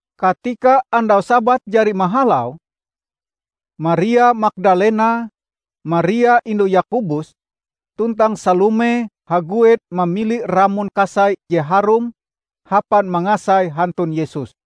Katika andau Sabat jari mahalau, Maria Magdalena, Maria indu Yakobus tuntang Salome haguet mamili ramon kasai je harum hapan mangasai hantun Yesus.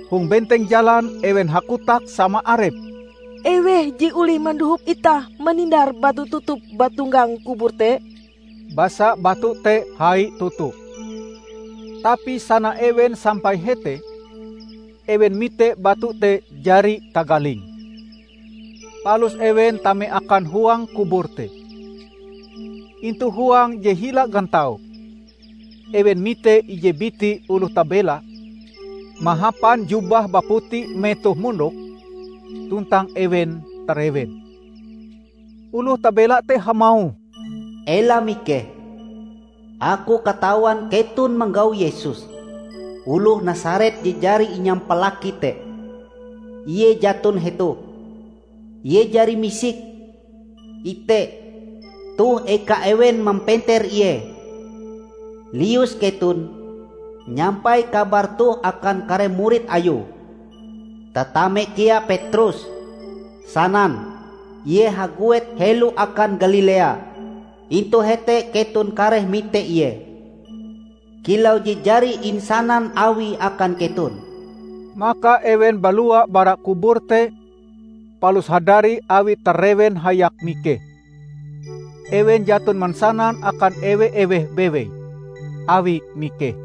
Hong benteng jalan, ewen hakotak sama arepe, "Eweh je olih mandohop itah manindar batu tutup bauntonggang kubur te?" Basa batu te hai toto. Tapi sana ewen sampai hete ewen mite batu te jari tagaling. Palus ewen tame akan huang kubur te. Intu huang je hila gantau, ewen mite ije biti oloh tabela mahapan jubah baputi metohe mondok, tuntang ewen tarewen. Oloh tabela te hamauh, "Ela mikeh! Aku katawan keton manggau Yesus oloh Nasaret je jari inyampalaki te. Ie jaton hetoh. Ie jari misik! Ite, toh eka ewen mampeter Ie. Lius keton, nyampai kabar toh akan kare murid Ayue, tatame kea Petrus. Sanan, 'Ie haguet helo akan Galilea. Intu hete keton kareh mite Ie, kilau je jari insanan Awie akan keton.' " Maka ewen balua bara kubur te palus hadari awie tarewen hayak mikeh. Ewen jaton mansanan akan ewe-eweh bewei awie mikeh. [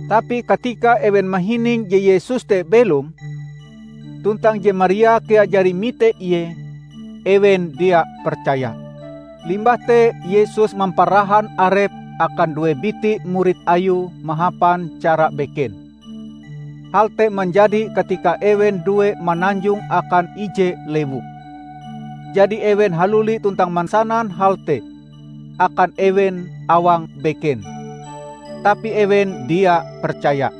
Tapi katika ewen mahining je Yesus te belom, tuntang je Maria kea jari mite Ie, ewen dia percaya. Limbah te Yesus mamparahan arepe akan due biti murid Ayue mahapan cara beken. Hal te manjadi katika ewen due mananjong akan ije lewu. Jadi ewen haluli tuntang mansanan hal te akan ewen awang beken. Tapi ewen dia percaya.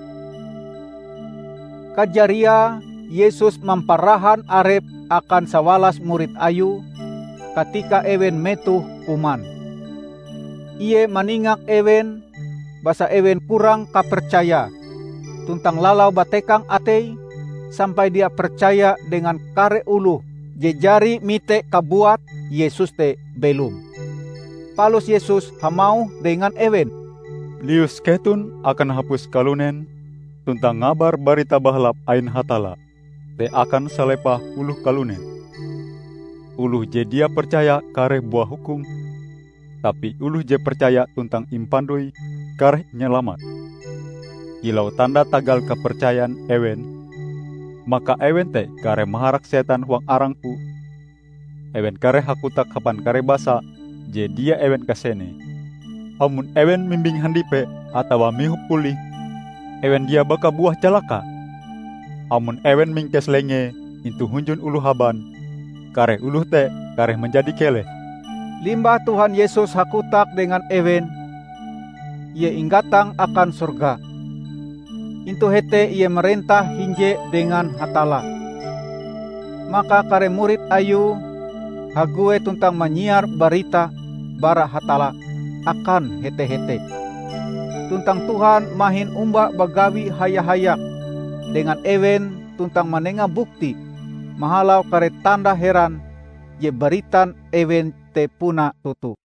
Kajariae, Yesus mamparahan Arepe akan sawalas murid Ayue, katika ewen metoh kuman. Ie maningak ewen basa ewen kurang kapercayae tuntang lalau batekang ateie sampai dia percaya dengan kare oloh je jari mite kabuat Yesus te belom. Palus Yesus hamauh dengan ewen, "Lius keton akan hapus kalunen tuntang ngabar Barita Bahalap ain Hatalla te akan salepah oloh kalunen. Oloh je dia percaya kareh buah hukum. Tapi oloh je percaya tuntang impandoi, kareh inyalamat. Kilau tanda tagal kapercayan ewen, maka ewen te kareh maharak setan huang arang-Ku; ewen kareh hakotak hapan kare basa je dia ewen kasenee. Amon ewen mimbing handipe atawa mihop pulih, ewen dia baka buah calaka. Amon ewen mingkes lengee intu hunjun oloh haban, kare oloh te kareh manjadi keleh." Limbah Tuhan Yesus hakotak dengan ewen, ie inggatang akan sorga. Intu hete Ie marentah hinje dengan Hatalla. Maka kare murid Ayue haguet tuntang manyiar barita bara Hatalla akan hete-hete. Tuntang Tuhan mahin omba bagawi haya-hayak dengan ewen tuntang manenga bukti mahalau kare tanda heran je baritan ewen te puna toto.] [